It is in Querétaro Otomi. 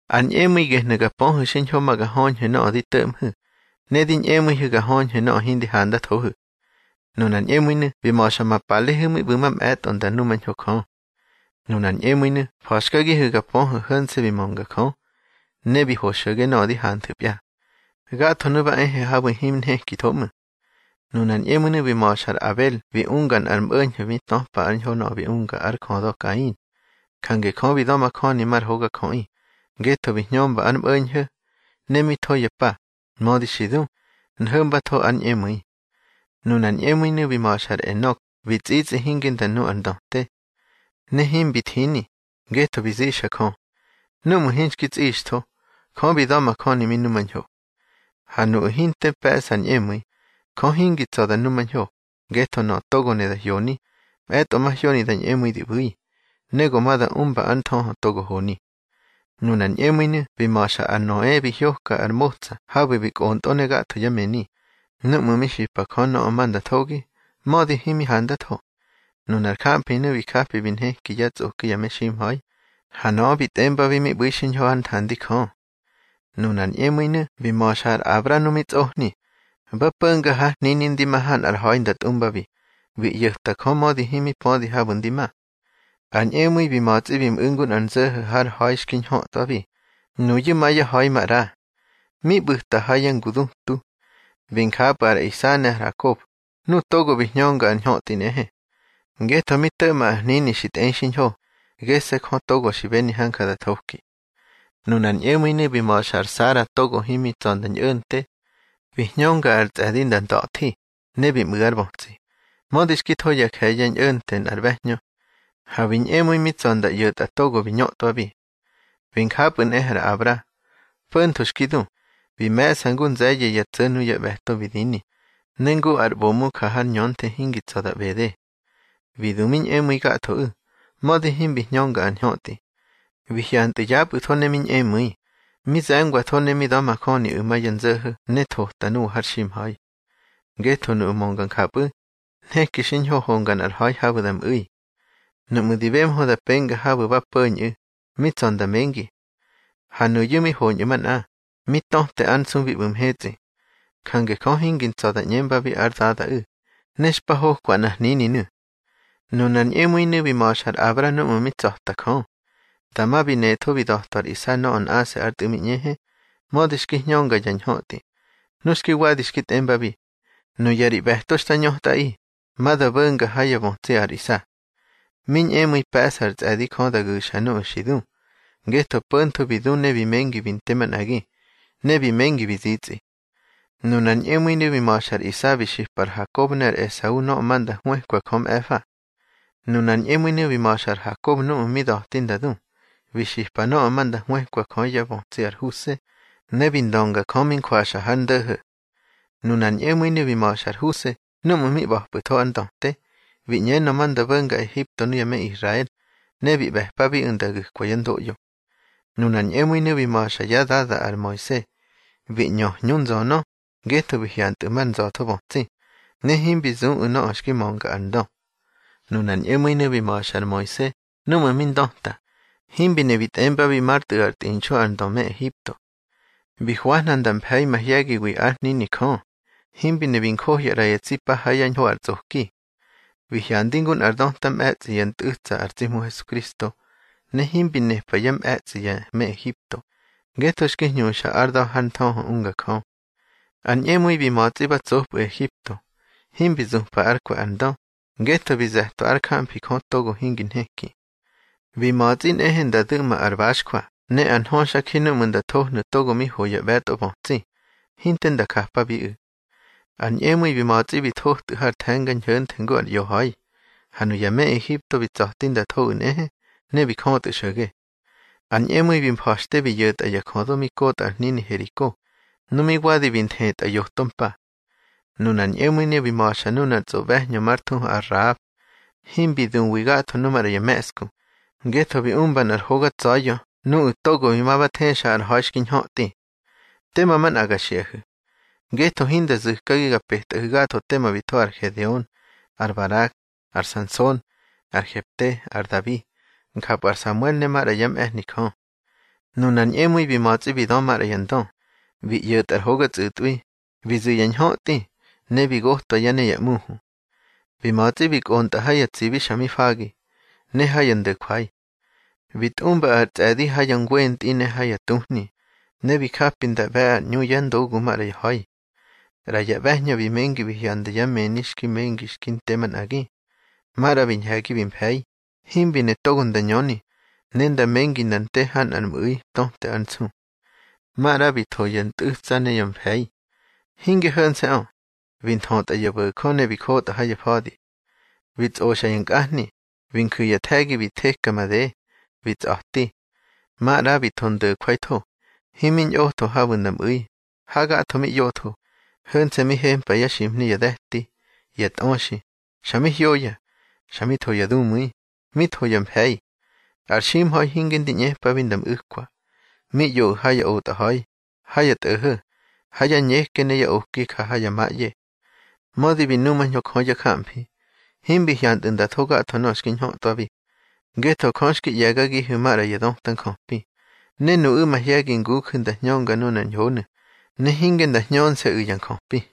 Ar ñꞌemu̱i gehnu̱ ga pöhu̱ xiñho ma ga höñhu̱ nöꞌö di to̱ꞌmhu̱, ne di ñꞌemu̱ihu̱ ga höñhu̱ nöꞌö hindi handathohu̱. Nunar ñꞌemu̱inu̱ bi ma̱xa ma palehu̱ mi ꞌbu̱ mamꞌe̱tꞌo nda numañho Jö. Nunar ñꞌemu̱inu̱ fa̱xkagihu̱ ga pöhu̱ ho̱nse̱ bi mönga Jö, ne bi ho xo̱ge nöꞌö di hanthu̱pya. Gathonu̱ ba e habu̱ himi nhekitho ꞌmu̱. Nunar ñꞌemu̱inu̱ bi ma̱xa ar Abel bi unga nꞌar mꞌo̱ñho̱ mi töpa ár ñho nöꞌö bi unga ár jödö Kain. Jange Jö bi da̱majöni mar hogajöꞌi, ngetho bi hñömba ár mꞌo̱ñho̱. Ne mi tho ya pa, mödi xi du, nho̱mbatho ár ñꞌemu̱i. Nunar ñꞌemu̱inu̱ bi ma̱xa ar Enok bi tsꞌitsꞌi hinge nda nu ar ndöte. Ne himbi thini, ngetho bi zixa Jö. Númꞌu̱ hinxki tsꞌixtho, Jö bi damajöni mi numañho. Ha nuꞌu̱ hinte pe̱ꞌsa ar ñꞌemu̱i, Jö hingi tsa̱ da numañho, ngetho nöꞌö togo ne da hyoni, mꞌe̱tꞌo mahyoni da ñꞌemu̱i di ꞌbu̱i, ne go ma da umba ár nthöhö togo honi. Nunar ñꞌemu̱inu̱ bi ma̱xa ar Noe bi hyoka ar motsa habu̱ bi kꞌontꞌö ne gatho yá mëni, núꞌmu̱ mi xipa Jö nöꞌö ma nda thogi, mödi himi handatho. Nunar jamfinu̱ bi japi bi nheki yá tsꞌoki ya meximha̱i, ha nöꞌö bi tꞌembabi mi ꞌbu̱i xiñho hár nthandi Jö. Nunar ñꞌemu̱inu̱ bi ma̱xa ar Abra nu mi tsꞌohni, ba po̱nga hár hnini ndi ma ha nꞌar ha̱i nda tꞌumbabi. Bi ꞌyo̱ta Jö mödi himi pödi habu̱ ndi ma. Ar ñꞌemu̱i bi ma̱tsꞌi bi mꞌu̱ ngu nꞌar nzo̱ho̱ har ha̱i xki ñhötꞌwabi, nuyu̱ ma yá ha̱i maꞌra. Mi ꞌbu̱ta ha ya ngudutu. Bi njapꞌu̱ ar Isa ne ar Hakob, nuꞌu̱ togo bi hñönga ar ñhötꞌi nꞌehe. Ngetho mi to̱ꞌma ar hnini xi tꞌei xiñho, gese̱ Jö togo xi beni hanja da thoki. Nunar ñꞌemu̱inu̱ bi ma̱xa ar Sara togo himi tsa̱ nda ñꞌo̱nte. Bi hñönga ar tsꞌe̱di nda nda̱thi, ne bi mꞌu̱ ár bötsi, mödi xki tho ya je̱ye̱ ñꞌo̱nte nꞌar ꞌbe̱hñö. Ha bi ñꞌemu̱i mi tsa̱ nda ꞌyo̱tꞌa togo bi ñötꞌwabi. Bi njapꞌu̱ nꞌehe ar Abra. Po̱ntho xki du, bi me̱ꞌsa ngu ár nze̱ye̱ ya tso̱ nuyá ꞌbe̱to bi dini, ne ngu ar ꞌbomu ja har ñönthe hingi tsa̱ da ꞌbede. Bi du mi ñꞌemu̱i gathoꞌu̱, mödi himbi hñönga ar ñhötꞌi. Bi hyantꞌu̱ yapꞌu̱tho ne mi ñꞌemu̱i, mi ze̱ngwatho ne mi da̱majöniꞌu̱ ma ya nzo̱ho̱ ne thota nuwa har ximha̱i. Ngetho nuꞌu̱ mönga njapꞌu̱, nheki xiñho honga nꞌar ha̱i habu̱ da mꞌu̱i. Nuꞌmu̱ di bemhö nda penga habu̱ ba po̱ñꞌu̱, mi tsa̱ nda mengi. Ha nuyu̱ mi hoñꞌu̱ manꞌa, mi töte ár nsu bi ꞌbu̱ mhetsꞌi. Jange Jö hingi ntsa̱ da ꞌñembabi ár Dadaꞌu̱, ne xpa hokwa nꞌar hnininu̱. Nunar ñꞌemu̱inu̱ bi ma̱xa ar Abra núꞌmu̱ mi tsa̱ta Jö. Dama bi netho bi da̱twa ar Isa nöꞌö nꞌase̱ ár tꞌu̱ mi ñꞌehe, mödi xki hñönga ya ñhötꞌi, nu xki wadi xki tꞌembabi: Nuya ri ꞌbe̱to xta ñötꞌaꞌi, ma da bo̱nga ha yá bötsi ar Isa. Mi ñꞌemu̱i pe̱ꞌsa ar tsꞌe̱di Jö da gu̱xa nuꞌu̱ xi du, ngetho po̱ntho bi du ne bi mengi bi nte manꞌagi, ne bi mengi bi zitsꞌi. Nunar ñꞌemu̱inu̱ bi ma̱xa ar Isa bi xipa ar Hakob ne ar Esau nöꞌö ma nda hwëkwa Jö mꞌe̱fa. Nunar ñꞌemu̱inu̱ bi ma̱xa ar Hakob núꞌmu̱ mi da̱tꞌi nda du, bi xipa nöꞌö ma nda hwëkwa Jö yá bötsi ar Huse, ne bi ndönga Jö mi njwaxa hár ndo̱ho̱. Nunar ñꞌemu̱inu̱ bi ma̱xa ar Huse núꞌmu̱ mi ꞌba̱pꞌu̱tho ár ndöte, bi ꞌñenö ma nda bo̱nga Ehipto nuya me Israel, ne bi ꞌbe̱pabiꞌu̱ nda gu̱kwa yá ndoꞌyo. Nunar ñꞌemu̱inu̱ bi ma̱xa yá dada ar Moise, bi ꞌñö hñu nzönö, ngetho bi hyantꞌu̱ mar nza̱tho bötsi, ne himbi zuꞌu̱ nöꞌö xki mönga ar ndö. Nunar ñꞌemu̱inu̱ bi ma̱xa ar Moise núꞌmu̱ mi ndöta, himbi ne bi tꞌembabi már tꞌu̱ ár tꞌinxu ar ndö me Ehipto. Bi hwahna nda mfe̱i mahye̱giwi ár hnini Jö, himbi ne bi njohya ꞌra ya tsi pa ha yá ñho ar tsꞌoki. Bi hyandi ngu nꞌar döta mꞌe̱tsꞌi yá ntꞌu̱tsa ar tsi Hmu Hesukristo, ne himbi nepa yá mꞌetsꞌi ya me Ehipto, ngetho xki hñuxa ár da̱ har nthöhö unga Jö. Ar ñꞌemu̱i bi ma̱tsꞌi ba tsopꞌu̱ Ehipto, himbi zupa ár kwe̱ ar ndö, ngetho bi ze̱twa ár jamfi Jö togo hingi nheki. Bi ma̱tsꞌi nꞌehe nda du̱ꞌma ar baxjwa ne ar nhöxa ji núꞌmu̱ nda thohnu̱ togo mi ho ya ꞌbe̱tꞌo bötsi, hinte nda japabiꞌu̱. Ar ñꞌemu̱i bi ma̱tsꞌi bi thotꞌu̱ har The̱nga Ñho̱nthe ngu ar ꞌyoñha̱i, ha nuya me Ehipto bi tsa̱ti nda thoꞌu̱ nꞌehe, ne bi jötꞌu̱ xo̱ge. Ar ñꞌemu̱i bi mfa̱xte bi yo̱tꞌa ya jödo mi kotꞌa ar hnini Heriko, nu mi wadi bi nthetꞌa yoto mpa. Nunar ñꞌemu̱inu̱ bi ma̱xa nunar tsꞌoꞌbe̱hñö már thuhu ar Rahab. Himbi duwi gatho nu maꞌra ya me̱ꞌsku, ngetho bi umba nꞌar hoga tsa̱ya̱ nuꞌu̱ togo bi ma ba thexa ar ha̱i xki ñhötꞌi. Tema manꞌa ga xiꞌahu̱. Ngetho hinda zu̱kagi ga petꞌahu̱ gatho tema bi tho ar Gedeon, ar Barak, ar Sanson, ar Hefte, ar Dabi, njapꞌu̱ ar Samuel ne maꞌra yá mꞌe̱hni Jö. Nunar ñꞌemu̱i bi ma̱tsꞌi bi dö maꞌra ya ndö, bi ꞌyo̱tꞌa ar hoga tsꞌu̱tꞌwi, bi zu̱ ya ñhötꞌi, ne bi gotꞌwa yá ne ya ꞌmuhu. Bi ma̱tsꞌi bi kꞌontꞌa ha ya tsibi xa mi fagi, ne ha ya ndo̱jwai. Bi tꞌumba ar tsꞌe̱di ha yá ngwentꞌi ne ha ya tuhni, ne bi japi nda ꞌbe̱ ar ꞌñu yá ndogu maꞌra ya ha̱i. ꞌRa ya ꞌbe̱hñö bi mengi bi hyanda yá mëni xki mengi xki nte manꞌagi. Maꞌra bi ñhe̱gi bi mfe̱i, himbi ne togo nda ñöni, ne nda mengi nda nte ha nꞌar mꞌu̱i töte ár nsu. Maꞌra bi tho ya ntꞌu̱tsa ne ya mfe̱i. Hinge ho̱nse̱ꞌö, bi nthötꞌa ya bo̱jö ne bi jotꞌa ha ya fa̱di. Bi tsꞌoxa ya nkꞌahni, bi nju̱ ya nthe̱gi bi theka made, bi tsꞌa̱ti. Maꞌra bi tho ndo̱jwaitho, himi ñꞌotho habu̱ nda mꞌu̱i, hagatho mi ꞌyotho, ho̱nse̱ mi hempa yá ximhni ya de̱ti, ya tꞌöxi, xa mi hyoya, xa mi tho ya dumu̱i, mi tho ya mfe̱i. Ar ximha̱i hinge ndi ꞌñepabi nda mꞌu̱kwa. Mi ꞌyoꞌu̱ ha ya otꞌaha̱i, ha ya tꞌo̱ho̱, ha ya ñeke ne ya oki ja ha ya maꞌye. Mödi bi numañho Jö yá jamfi, himbi hyantꞌu̱ nda tho gatho nöꞌö xki ñhötꞌwabi. Ngetho Jö xki ꞌye̱gagihu̱ maꞌra ya döta njöpi, ne nuꞌu̱ mahye̱gi nguju̱ nda hñönga nunar ñhonu̱, ne hinge nda hñönse̱ꞌu̱ ya njöpi.